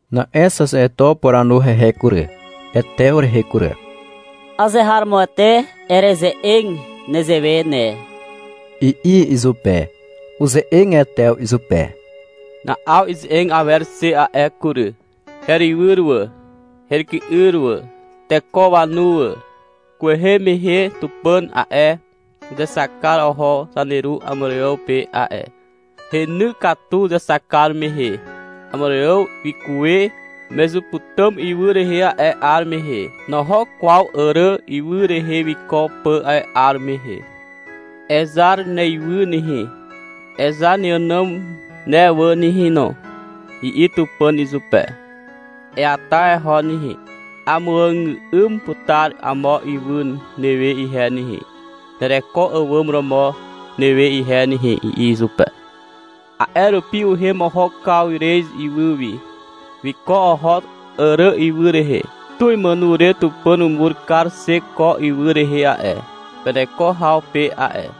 Na'e xaxeto upuranu hehe kury, Etew rehe kury. -Azeharomoete ereze'eg nezewe ne, i'i izupe. Uze'eg Etew izupe. Na'aw ize'eg awer xe a'e kury. — Herywyr wà, heryky'yr wà. Teko wanu wà. Kwehe mehe Tupàn a'e, uzexak kar oho zaneru Àmàrààw pe a'e. Heny katu uzexak kar mehe. Àmàrààw wikuwe Mezuputàm ywy rehe a'e 'ar mehe. Noho kwaw Àrà ywy rehe wiko pà a'e 'ar mehe. — Ezar neywy nehe, ezar neànàm ne wà nehe no, i'i Tupàn izupe. — Eata eho nehe. Amuàgà'ym putar amo ywy newe ihe nehe, nereko àwàm romo newe ihe nehe, i'i izupe. A'e rupi uhem oho Kawrez ywy wi. Wiko oho Àrà ywy rehe. Tu imàno re Tupàn umur kar xe ko ywy rehe a'e, peneko haw pe a'e.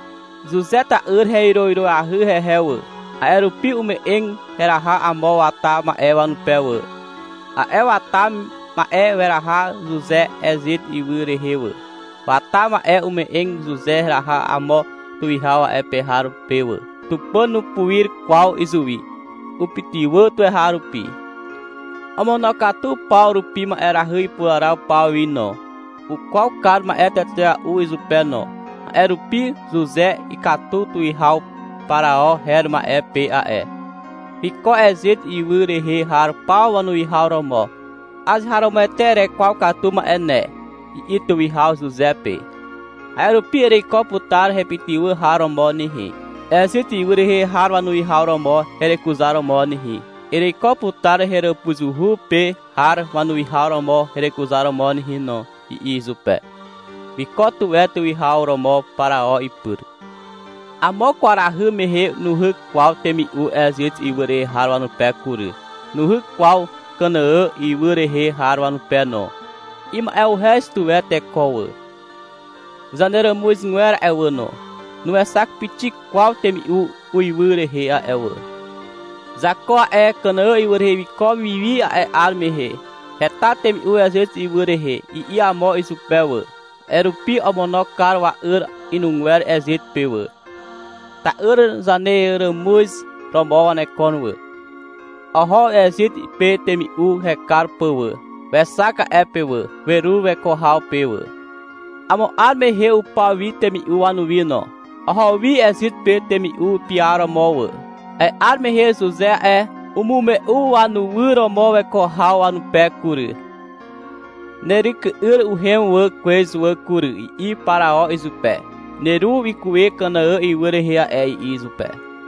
Zuze tyky'yr hewyrowyroahy hehe wà. A'e rupi ume'eg heraha amo wata ma'e wanupe wà. A'e wata ma'e weraha Zuze Ezit ywy rehe wà. Wata ma'e ume'eg Zuze heraha amo tuwihaw a'e pe har pe wà. Tupàn nupuir kwaw izuwi. Upytywà tuweharupi. Omonokatu paw rupi ma'erahy ipuraraw paw wi no. Ukwaw kar ma'e tetea'u izupe no. A'e rupi Zuze ikatu tuwihaw Parao her ma'e pe a'e. Wiko Ezit ywy rehe har paw wanuwihaw romo. -Azeharomoete erekwaw katu ma'e ne, i'i tuwihaw Zuze pe. — A'e rupi ereiko putar hepytywà har romo nehe, Ezit ywy rehe har wanuwihaw romo herekuzaromo nehe. Ereiko putar heràpuzuhu pe har wanuwihaw romo herekuzaromo nehe no, i'i izupe. Wiko tuwe tuwihaw romo Parao ipyr. — Amo kwarahy mehe nuhyk kwaw temi'u Ezit ywy rehe har wanupe kury. Nuhyk kwaw Kànàà ywy rehe har wanupe no. Ima'uhez tuwe teko wà. Zaneràmuzgwer a'e wà no, nuexak pixik kwaw temi'u uiwy rehe a'e wà. Zako a'e, Kànàà ywy rehe wiko wi wi a'e 'ar mehe. — Heta temi'u Ezit ywy rehe, i'i amo izupe wà. A'e rupi omono kar wa'yr inugwer Ezit pe wà. (Ta'yr zaneràmuz romo wanekon wà.) Oho Ezit pe temi'u hekar pà wà. (Wexak a'e pe wà. Werur weko haw pe wà.) Amo 'ar mehe upaw wi temi'u wanuwi no. Oho wi Ezit pe temi'u piaromo wà. A'e 'ar mehe Zuze a'e, umume'u wanywyr romo weko haw wanupe kury. -Neryky'yr uhem wà kwez wà kury, i'i Parao izupe. — Neru wikuwe Kànàà ywy rehe a'e, i'i izupe.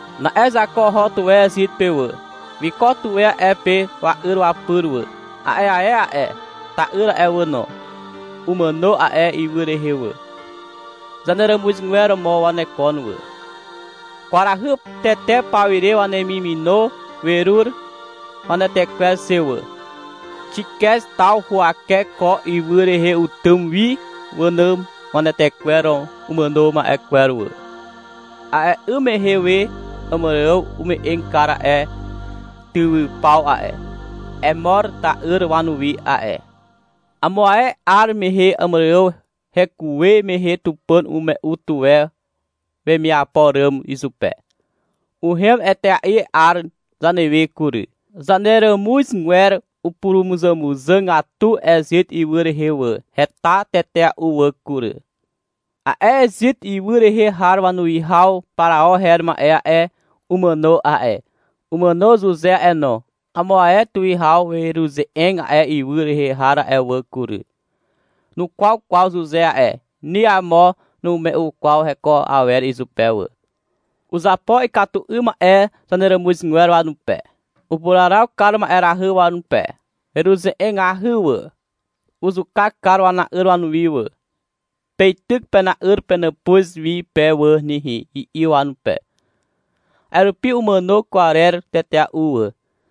Na'e Zako oho tuwe Ezit pe wà. Wiko tuwe a'e pe wa'yr wapyr wà. A'e ae a'e, ta'yr a'e wà no, umàno a'e ywy rehe wà. Zaneràmuzgwer romo wanekon wà. Kwarahy tete pawire wanemimino werur wanetekwer xe wà. Xikez taw huwake ko ywy rehe utym wi wànàm wanetekwer umàno ma'e kwer wà. (A'e 'ym mehe we Àmàrààw ume'eg kar a'e tywypaw a'e, Emor ta'yr wanuwi a'e.) Amo ae 'ar mehe Àmàrààw hekuwe mehe Tupàn umume'u tuwe wemiapo ràm izupe. Uhem etea'i a'e 'ar zanewe kury. Zaneràmuzgwer upurumuzàmuzàgatu Ezit ywy rehe wà. Heta tetea'u wà kury. A'e Ezit ywy rehe har wanuwihaw Parao her ma'e a'e, umàno a'e. Umàno Zuze a'e no. Amo ae tuwihaw weruze'eg a'e ywy rehe har a'e wà kury. Nukwaw kwaw Zuze a'e. Ni amo numume'u kwaw heko awer izupe wà. Uzapo ikatu 'ym ma'e zaneràmuzgwer wanupe. Upuraraw kar ma'erahy wanupe. Weruze'egahy wà. Uzuka kar wana'yr wanuwi wà. — Peityk pena'yr penàpuz wi pe wà nehe, i'i wanupe. A'e rupi umàno kwarer tetea'u wà.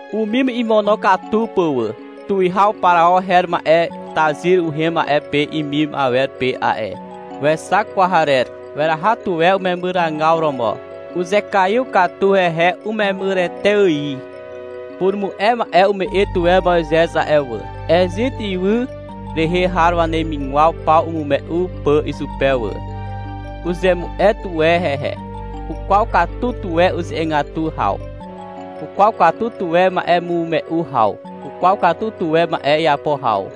Umim imonokatu pà wà. Tuwihaw Parao her ma'e tazyr uhem a'e pe imim awer pe a'e. Wexak kwarer. Weraha tuwe umemyragaw romo. Uzekaiw katu hehe umemyrete ài. Purumu'e ma'e umu'e tuwe Moizez a'e wà, Ezit ywy rehe har wanemigwaw paw imume'u pà izupe wà. Uzemu'e tuwe hehe. Ukwaw katu tuwe uze'egatu haw. Ukwaw katu tuwe ma'emume'u haw. Ukwaw katu tuwe ma'e iapo haw.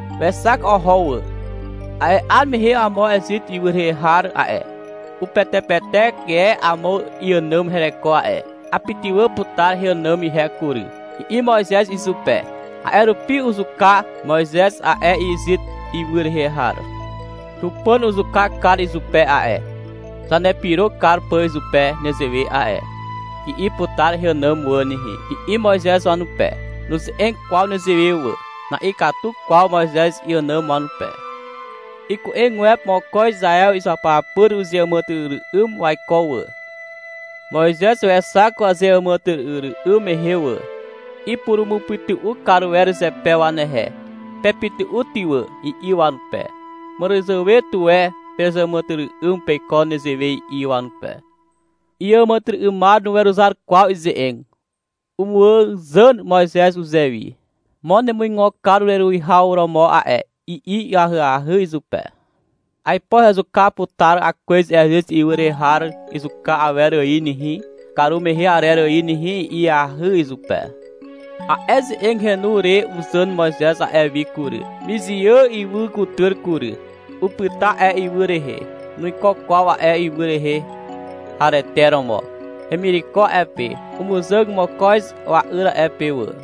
Wexak oho wà. A'e 'ar mehe amo Ezit ywy rehe har a'e, upetepetek e amo iànàm hereko a'e. — Apytywà putar heànàm ihe kury, i'i Moizez izupe. A'e rupi uzuka Moizez a'e Ezit ywy rehe har. — Tupàn uzuka kar izupe a'e, zanepyro kar pà izupe nezewe a'e, i'i putar heànàm wà nehe, i'i Moizez wanupe. Nuze'eg kwaw nezewe wà. Na'ikatu kwaw Moizez iànàm wanupe. Iku'egwepe mokoz Izaew izuapyapyr uzeàmàtyry'ym waiko wà. Moizez wexak wazeàmàtyry'ym mehe wà. Ipurumupytu'u kar wer zepe wanehe. — Pepytu'u ty wà, i'i wanupe. — Màràzàwe tuwe pezeàmàtyry'ym peiko nezewe, i'i wanupe. Iàmàtyry'ymar nuweruzar kwaw ize'eg. Umuàzàn Moizez uzewi. — Mo nemuigo kar ureruwihaw romo a'e, i'i ahyahy izupe. — Aipo hezuka putar akwez Ezit ywy rehe har izuka awer ài nehe, karumehe arer ài nehe, i'iahy izupe. A'e ze'eg henu re uzàn Moizez a'e wi kury, Mizià ywy kutyr kury. Upyta a'e ywy rehe. Nuiko kwaw a'e ywy rehe harete romo. Hemireko a'e pe. Umuzàg mokoz wa'yr a'e pe wà.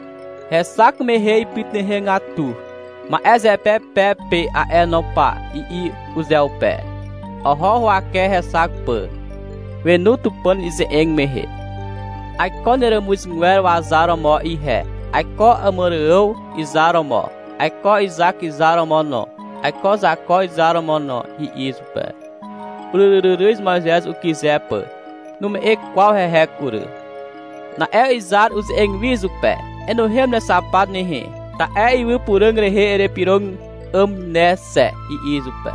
Hexak mehe ipytuhegatu. — Ma'e zepe pe pe a'e no pa, i'i uzeupe. Oho huwake hexak pà. Wenu Tupàn ize'eg mehe. — Aiko neràmuzgwer wazar romo ihe, aiko Àmàrààw izar romo, aiko Izak izar romo no, aiko Zako izar romo no, i'i izupe. Uryryryryz Moizez ukyze pà. Nume'e kwaw hehe kury. Na'e Izar uze'eg wi izupe. -Enuhem nexapat nehe. Ta'e ywy puràg rehe erepyrog 'àm ne xe, i'i izupe.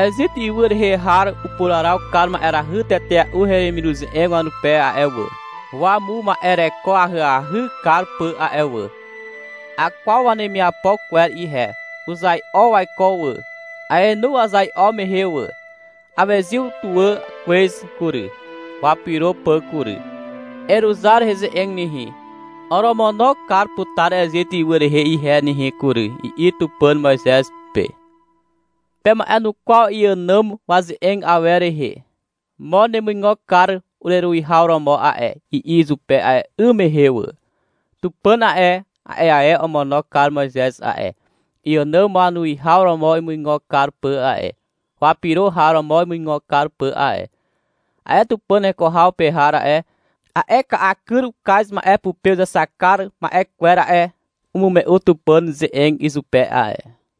Ezit ywy rehe har upuraraw kar ma'erahy tetea'u heremiruze'eg wanupe a'e wà, wamuma'ereko ahyahy kar pà a'e wà. Akwaw wanemiapo kwer ihe. Uzai'o waiko wà. Aenu wazai'o mehe wà. Awezyw tuwà kwez kury, wapyro pà kury. Eruzar heze'eg nehe. Oromono kar putar Ezit ywy rehe ihe nehe kury, i'i Tupàn Moizez pe. Pema'enukwaw iànàm waze'eg awer rehe. — Mo nemuigo kar ureruwihaw romo a'e, i'i izupe a'e 'ym mehe wà. Tupàn a'e, a'e ae omono kar Moizez a'e, iànàm wanuwihaw romo imuigo kar pà a'e, wapyro har romo imuigo kar pà a'e. A'e Tupàn heko haw pe har a'e, a'e ka'a kyr ukaz ma'e pupe uzexak kar ma'e kwer a'e, umume'u Tupàn ze'eg izupe a'e.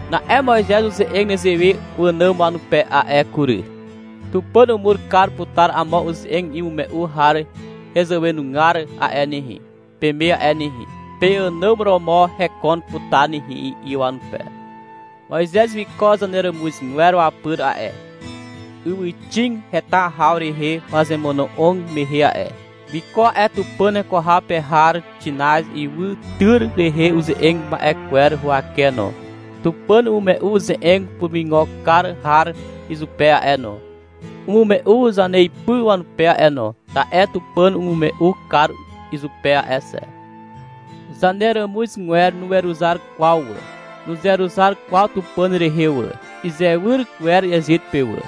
Na'e Moizez uze'eg nezewe wànàm wanupe a'e kury. Tupàn umur kar putar amo uze'eg imume'u har hezàwenugar a'e nehe, peme a'e nehe. Peànàm romo hekon putar nehe, i'i wanupe. Moizez wiko zaneràmuzgwer wapyr a'e, ywyxig heta haw rehe wazemono'og mehe a'e. Wiko a'e Tupàn heko haw pe har Xinaz ywytyr rehe uze'eg ma'e kwer huwake no. Tupàn umume'u uze'eg purumuigo kar har izupe a'e no. Umume'u zaneipy wanupe a'e no, ta'e Tupàn umume'u kar izupe a'e xe. Zaneràmuzgwer nuweruzar kwaw wà. Nuzeruzar kwaw Tupàn rehe wà. Izewyr wer Ezit pe wà.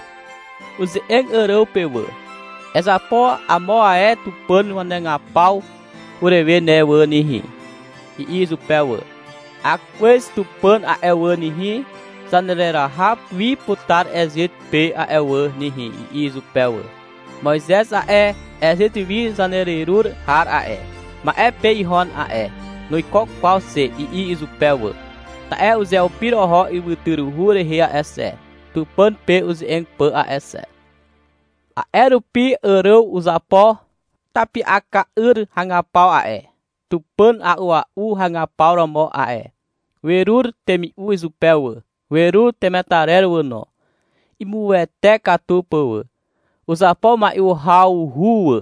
Uze'eg Àràw pe wà. — Ezapo amo ae tupàn wanagapaw urewe ne wà nehe, i'i izupe wà. — Akwez tupàn a'e wà nehe, zanereraha wi putar Ezit pe a'e wà nehe, i'i izupe wà. — Moizez a'e, Ezit wi zanererur har a'e, ma'e pe ihon a'e. Nuiko kwaw xe, i'i izupe wà. (Ta'e uzeupir oho ywytyruhu rehe a'e xe, Tupàn pe uze'eg pà a'e xe.) A'e rupi Àràw uzapo tapi'aka'yr hagapaw a'e, tupàn a'ua'u hagapaw romo a'e. Werur temi'u izupe wà, werur temetarer wà no, imuwete katu pà wà. Uzapo mai'u hawhu wà,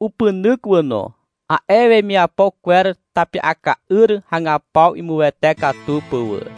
upynyk wà no, a'e wemiapo kwer tapi'aka'yr hagapaw imuwete katu pà wà.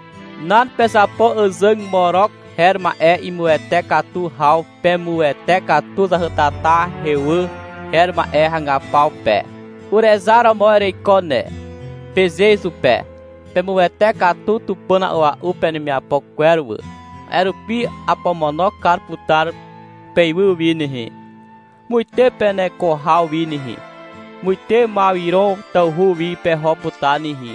Nan. Pezapo àzàg Morok her ma'e imuwete katu haw Pemuwete katu zahytata Hewà her ma'e hagapaw pe. — Urezar romo ereiko ne, peze izupe. Pemuwete katu tupàn a'ua'u penemiapo kwer wà. A'e rupi apomono kar putar peywy wi nehe, muite peneko haw wi nehe, Muite Mawiron tawhu wi peho putar nehe.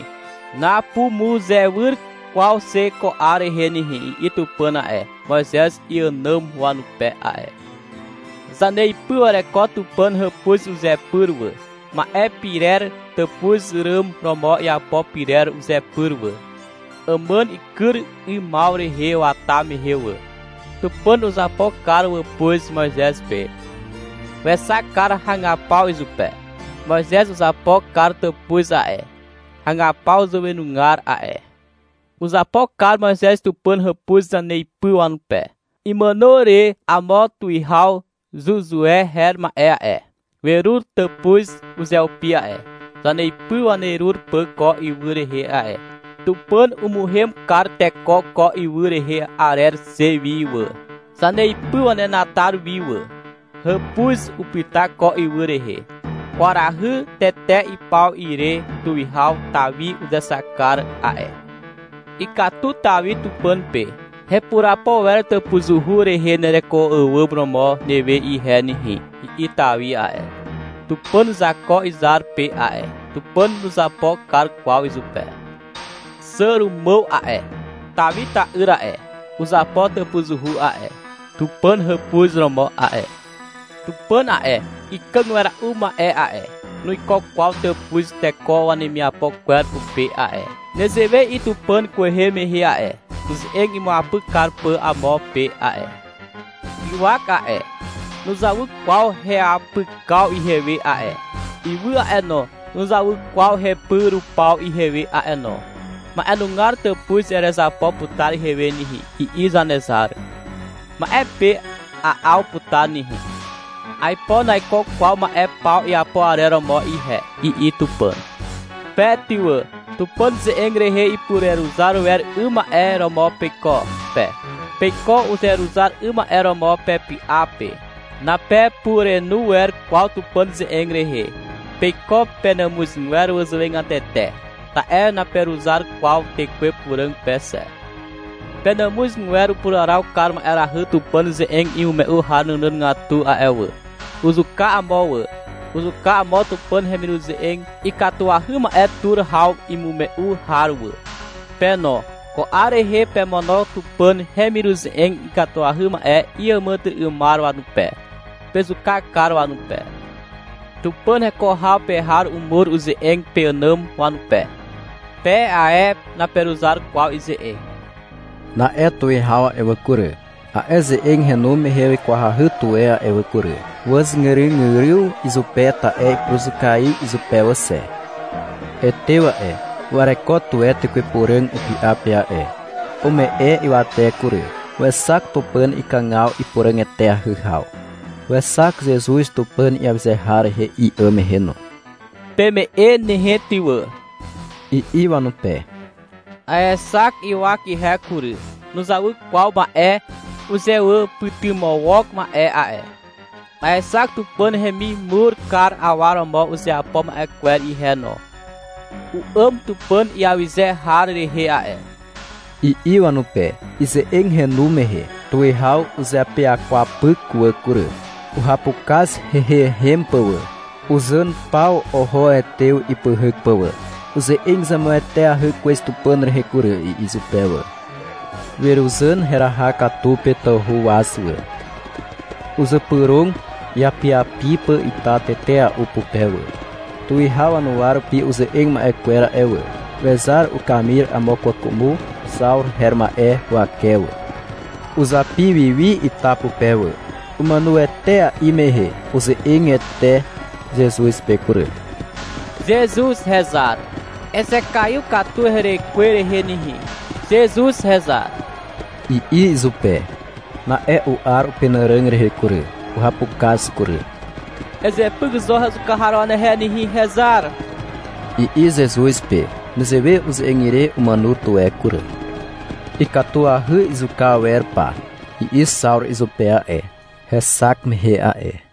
Napumuzewyr kwaw xe ko 'ar rehe nehe, i'i Tupàn a'e, Moizez iànàm wanupe a'e. Zaneipy wereko Tupàn hàpuz uzepyr wà, ma'e pirer tàpuz ràn romo iapo pyrer uzepyr wà, àmàn ikyr 'ymaw rehe wata mehe wà. Tupàn uzapo kar wàpuz Moizez pe. Wexak kar hagapaw izupe. Moizez uzapo kar tàpuz a'e, hagapaw zàwenugar a'e. Uzapo kar Moizez Tupàn hàpuz zaneipy wanupe. Imàno re amo tuwihaw Zuzue her ma'e a'e, werur tàpuz uzeupi a'e, zaneipy wanerur pà ko ywy rehe a'e. Tupàn umuhem kar teko ko ywy rehe arer xe wi wà, zaneipy wanenatar wi wà. Hàpuz upyta ko ywy rehe. Kwarahy tete ipaw ire tuwihaw Tawi uzexak kar a'e. Ikatu Tawi Tupàn pe. -Hepurapo wer tàpuzuhu rehe nereko àwàm romo newe ihe nehe, i'i Tawi a'e, Tupàn Zako izar pe a'e. Tupàn nuzapo kar kwaw izupe. Xàrumàw a'e, Tawi ta'yr a'e, uzapo tàpuzuhu a'e, Tupàn hàpuz romo a'e. Tupàn a'e, ikàg wera'u ma'e a'e, nuiko kwaw tàpuz teko wanemiapo kwer pupe a'e. Nezewe i'i Tupàn kwehe mehe a'e, uze'eg imuapyk kar pà amo pe a'e. — Ywak a'e, nuzawy kwaw heapykaw ihewe a'e. Ywy a'e no, nuzawy kwaw hepy rupaw ihewe a'e no. Ma'enugar tàpuz erezapo putar ihewe nehe, i'i Zanezar. — Ma'e pe a'aw putar nehe. Aipo naiko kwaw ma'e paw iapo arer romo ihe, i'i Tupàn. Pe ty wà, Tupàn ze'eg rehe ipureruzar wer 'ym ma'e romo peiko pe. Peiko uzeruzar 'ym ma'e romo pepy'a pe. Napepurenu wer kwaw Tupàn ze'eg rehe. Peiko penàmuzgwer wazàwegatete. Ta'e naperuzar kwaw Tekwe Puràg pe xe. Penàmuzgwer upuraraw kar ma'erahy Tupàn ze'eg imume'u har nànàgatu a'e wà. Uzuka amo wà. Uzuka amo Tupàn hemiruze'eg ikatuahy ma'e tur haw imume'u har wà. Pe no, ko 'ar rehe pemono Tupàn hemiruze'eg ikatuahy ma'e iàmàtyry'ymar wanupe. Pezuka kar wanupe. Tupàn heko haw pe har umur ize'eg peànàm wanupe. Pe ae naperuzar kwaw ize'eg. Na'e tuwihaw a'e wà kury, a'e ze'eg henu mehe wikwahy tuwe a'e wà kury. Wàzgyrygyryw izupe ta'e ipuruzukaiw izupe wà xe. Etew a'e, wereko tuwe Tekwe Puràg upy'a pe a'e. Ume'e ywate kury. Wexak Tupàn ikàgaw ipuràg eteahy haw. Wexak Zezuz Tupàn iawyze har rehe i'àm mehe no. — Peme'e nehe ty wà, i'i wanupe. -Aexak ywak ihe kury. Nuzawy kwaw ma'e uzewàpytymawok ma'e a'e. Aexak Tupàn hemimur kar awa romo uzeapo ma'e kwer ihe no. U'àm Tupàn iawyze har rehe a'e, i'i wanupe. Ize'eg henu mehe tuwihaw uzeapyakwapyk wà kury. Uhapukaz heiheihem pà wà. Uzàn paw oho Etew ipyhyk pà wà. (— Uze'eg zemueteahy kwez Tupàn rehe kury, i'i izupe wà.) Weruzàn heraha katu pe tawhu waz wà. Uzypyrog iapiapi pà ita tetea'u pupe wà. Tuwihaw wanuwa rupi uze'eg ma'e kwer a'e wà, wezar ukamir amo kwàkwàmo Xawru her ma'e huwake wà. Uzapi wi wi ita pupe wà. Umàno etea'i mehe uze'eg Ete Zezuz pe kury. -Zezuz Hezar, ezekaiw katu herekwe rehe nehe, Zezuz Hezar, i'i izupe. Na'e u'ar upenàràg rehe kury. Uhapukaz kury. — Ezepyk zo hezuka har wanehe nehe, hezar, i'i Zezuz pe. Nezewe uze'eg ire umàno tuwe kury. -Ikatuahy izuka awer pa, i'i Xawru izupe a'e, hexak mehe a'e.